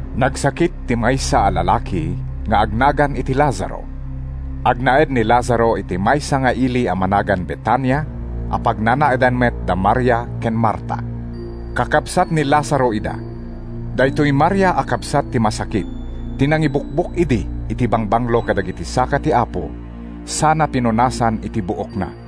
Nagsakit ti maysa a lalaki nga agnagan iti Lazaro. Agnaed ni Lazaro iti maysa nga ili a managan Betania a pagnanaedan met da Maria ken Marta. Kakabsat ni Lazaro ida. ( Daytoy Maria a kabsat ti masakit ti nangibukbok idi iti bangbanglo kadagiti saka ti Apo sana pinunasan iti buokna.)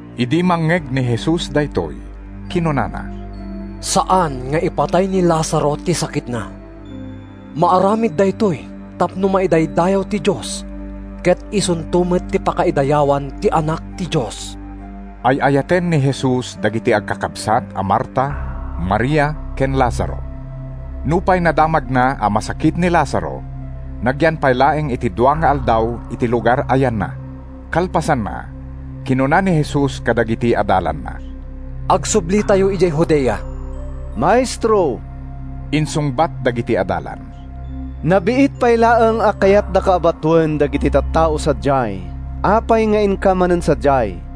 Idi mangngeg ni Jesus daytoy, kinunana, “Saan nga ipatay ni Lazaro ti sakitna. Maaramid daytoy tapno maidaydayaw ti Dios, ket isunto met ti pakaidayawan ti Anak ti Dios.” Ay-ayaten ni Jesus dagiti agkakabsat a Marta, Maria ken Lazaro. Nupay nadamagna a masakit ni Lazaro, nagyan pay laeng iti dua nga aldaw iti lugar a yanna. Kalpasanna, kinuna ni Jesus kadagiti adalanna, “Agsublitayo idiay Judea.” “Maestro,” insungbat dagiti adalan, “nabiit pay laeng a kayatdaka a batoen dagiti tattao sadiay. Apay nga inka manen sadiay?”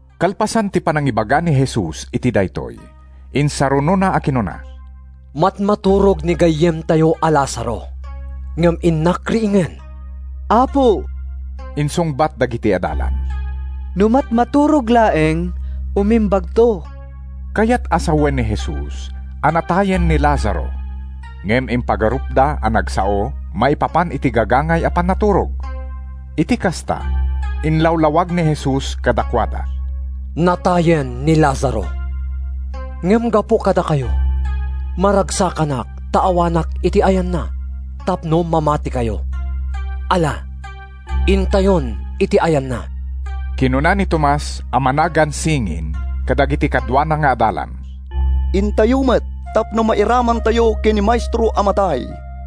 Kalpasan ti panangibaga ni Jesus iti daytoy, insarunona a kinuna, “Matmaturog ni gayyemtayo a Lazaro, ngem innak riingen.” “Apo,” insungbat dagiti adalan, “no matmaturog laeng, umimbagto.” Kayat a sawen ni Jesus a natayen ni Lazaro ngem impagarupda a nagsao maipapan iti gagangay a pannaturog. Iti kasta, inlawlawag ni Jesus kadakuada, “Natayen ni Lazaro. Ngem gapu kadakayo, maragsakanak ta awanak iti ayanna, tapno mamatikayo. Ala, intayon iti yanna.” Kinuna ni Tomas (a managan Singin) kadagiti kaduana nga adalan, “Intayo met tapno mairamantayo ken ni Maestro a matay!”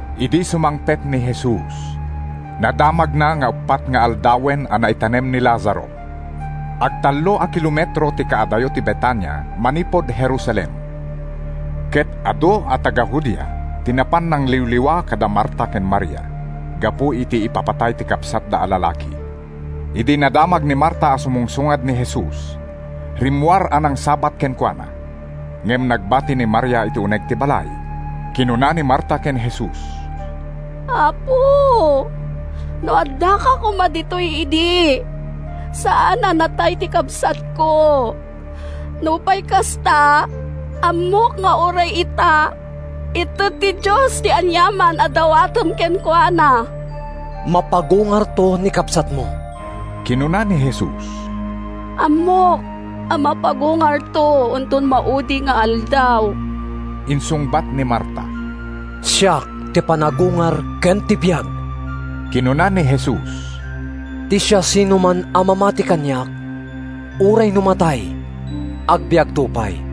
Idi sumangpet ni Jesus, nadamagna nga uppat nga aldawen a naitanem ni Lazaro. Agtallo a kilometro ti kaadayo ti Betania manipud Jerusalem, ket adu a taga-Judea ti napan nangliwliwa kada Marta ken Maria gapu iti ipapatay ti kabsatda a lalaki. Idi nadamag ni Marta a sumungsungad ni Jesus, rimmuar a nangsabat kenkuana. Ngem nagbati ni Maria iti uneg ti balay. Kinuna ni Marta ken Jesus, “Apo, no addaka koma ditoy idi, saan a natay ni kabsatko! Nupay kasta, ammok nga uray ita, ited ti Dios ti aniaman a dawatem kenkuana.” “Mapagungarto ni kabsatmo,” kinuna ni Jesus. “Ammok a mapagungarto inton maudi nga aldaw,” insungbat ni Marta. “Siak ti panagungar ken ti biag,” kinuna ni Jesus. “Ti siasinoman a mamati kaniak, uray no matay, agbiagto pay.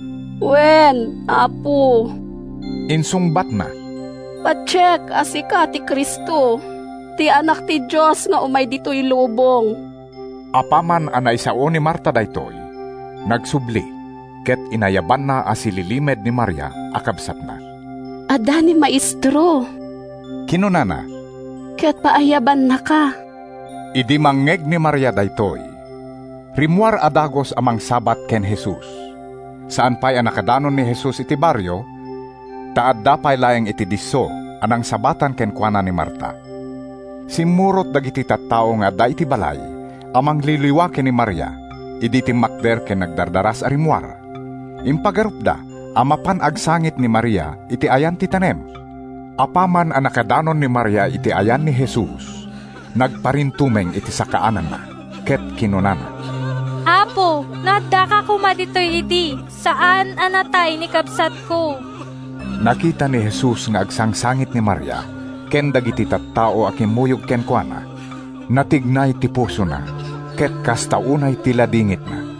“Wen, Apo,” insungbatna. “Patiek a sika ti Cristo, ti Anak ti Dios nga umay ditoy lubong.” Apaman a naisao ni Marta daytoy, nagsubli ket inayabanna a sililimed ni Maria a kabsatna. “Adda ni Maestro,” kinunana, “ket paayabannaka.” Idi mangngeg ni Maria daytoy, rimmuar a dagus a mangsabat ken Jesus. ( Saan pay a nakadanon ni Jesus iti barrio, ta adda pay laeng iti disso a nangsabatan kenkuana ni Marta.) Simmurot dagiti tattao nga adda iti balay a mangliwliwa ken ni Maria idi timmakder ken nagdardaras a rimmuar. Impagarupda a mapan agsangit ni Maria iti ayan ti tanem. Apaman a nakadanon ni Maria iti ayan ni Jesus, nagparintumeng iti sakaananna ket kinunana, “Apo, no addaka koma ditoy idi, saan a natay ni kabsatko!” Nakita ni Jesus nga agsangsangit ni Maria ken dagiti tattao a kimmuyog kenkuana. Natignay ti pusona ket kasta unay ti ladingitna.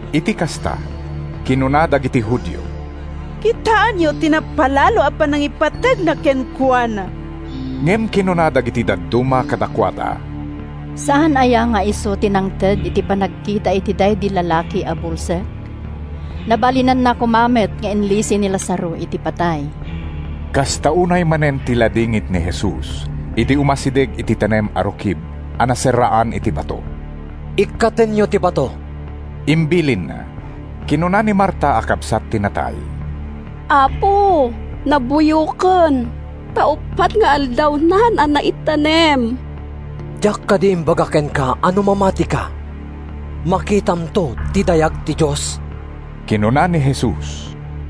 Iti kasta, kinuna dagiti Judio, “Kitaenyo ti napalalo a panangipategna kenkuana!” Ngem kinuna dagiti dadduma kadakuada, “Saan aya nga isu ti nangted iti panagkita iti daydi lalaki a bulsek? Nabalinanna koma met nga inlisi ni Lazaro iti patay.” Kasta unay manen ti ladingit ni Jesus idi umasideg iti tanem a rukib a naserraan iti bato. “Ikkatenyo ti bato,” imbilinna. Kinuna ni Marta a kabsat ti natay, “Apo, nabuyoken, ta uppat nga aldawnan a naitanem!” “Diak kadi imbaga kenka a no mamatika, makitamto ti dayag ti Dios?” kinuna ni Jesus.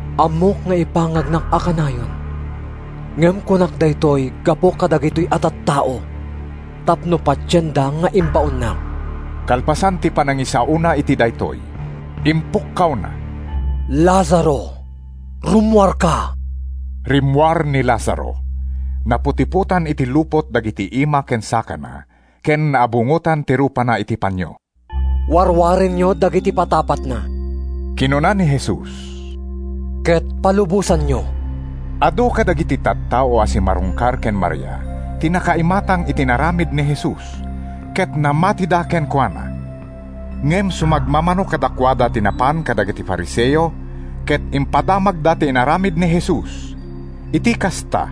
Ammok nga ipangagnak a kanayon, ngem kunak daytoy gapu kadagitoy a tattao tapno patienda nga imbaonnak.” Kalpasan ti panangisaona iti daytoy, impukkawna, “Lazaro, rummuarka!” Rimmuar ni Lazaro. Naputipotan iti lupot dagiti ima ken sakana ken naabungotan ti rupana iti panio. “Warwarenyo dagiti patapatna,” kinuna ni Jesus, “ket palubosanyo.” Adu kadagiti tattao a simmarungkar ken Maria ti nakaimatang iti inaramid ni Jesus, ket namatida kenkuana. Ngem sumagmamano kadakuada ti napan kadagiti Fariseo ket impadamagda ti inaramid ni Jesus. Iti kasta,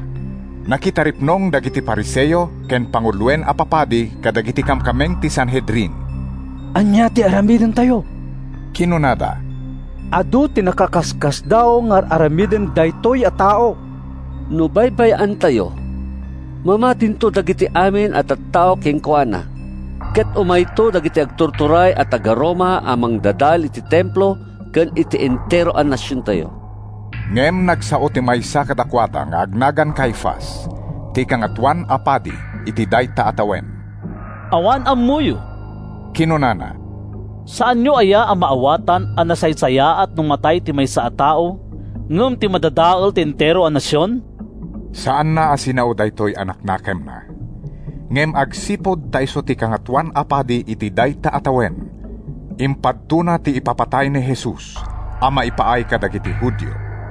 nakitaripnong dagiti Fariseo ken panguloen a papadi kadagiti kamkameng ti Sanhedrin. “Ania ti aramidentayo?” kinunada. “Adu ti nakaskasdaaw nga ar-aramiden daytoy a tao! No baybay-antayo, mamatinto dagiti amin a tattao kenkuana, ket umayto dagiti agtuturay a taga-Roma a mangdadael iti Templo ken iti entero a nasiontayo!” Ngem nagsao ti maysa kadakuada nga agnagan Caifas, ti Kangatoan a Padi iti dayta a tawen. “Awan ammoyo,” kinunana. “Saanyo aya a maawatan a nasaysayaat no matay ti maysa a tao, ngem ti madadael ti entero a nasion?” (Saanna a sinao daytoy a naknakemna, ngem agsipud ta isu ti Kangatoan a Padi iti dayta a tawen, impadtona ti ipapatay ni Jesus a maipaay kadagiti Judio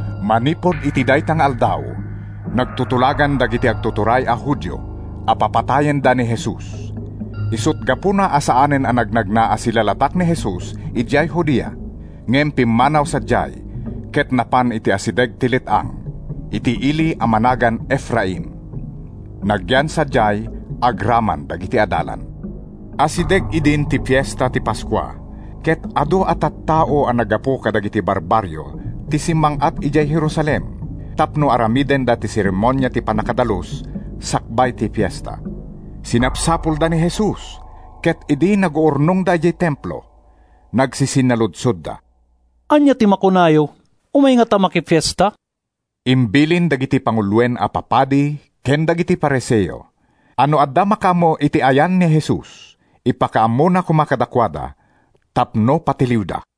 Manipud iti dayta nga aldaw, nagtutulagan dagiti agtuturay a Judio a papatayenda ni Jesus. Isut’ gapuna a saanen a nagnagna a silalatak ni Jesus idiay Judea, ngem pimmanaw sadiay ket napan iti asideg ti let-ang, iti ili a managan Efraim. Nagyan sadiay agraman dagiti adalan. Asideg idin ti Fiesta ti Paskua ket adu a tattao a naggapu kadagiti barbarrio ti simmang-at idiay Jerusalem tapno aramidenda ti seremonia ti pannakadalus sakbay ti fiesta. Sinapsapulda ni Jesus ket idi naguurnongda idiay Templo, nagsisinnaludsodda, “Ania ti makunayo? Umay ngata makifiesta?” Imbilin dagiti panguloen a papadi ken dagiti Fariseo a no adda makaammo iti ayan ni Jesus, ipakaammona koma kadakuada tapno patiliwda.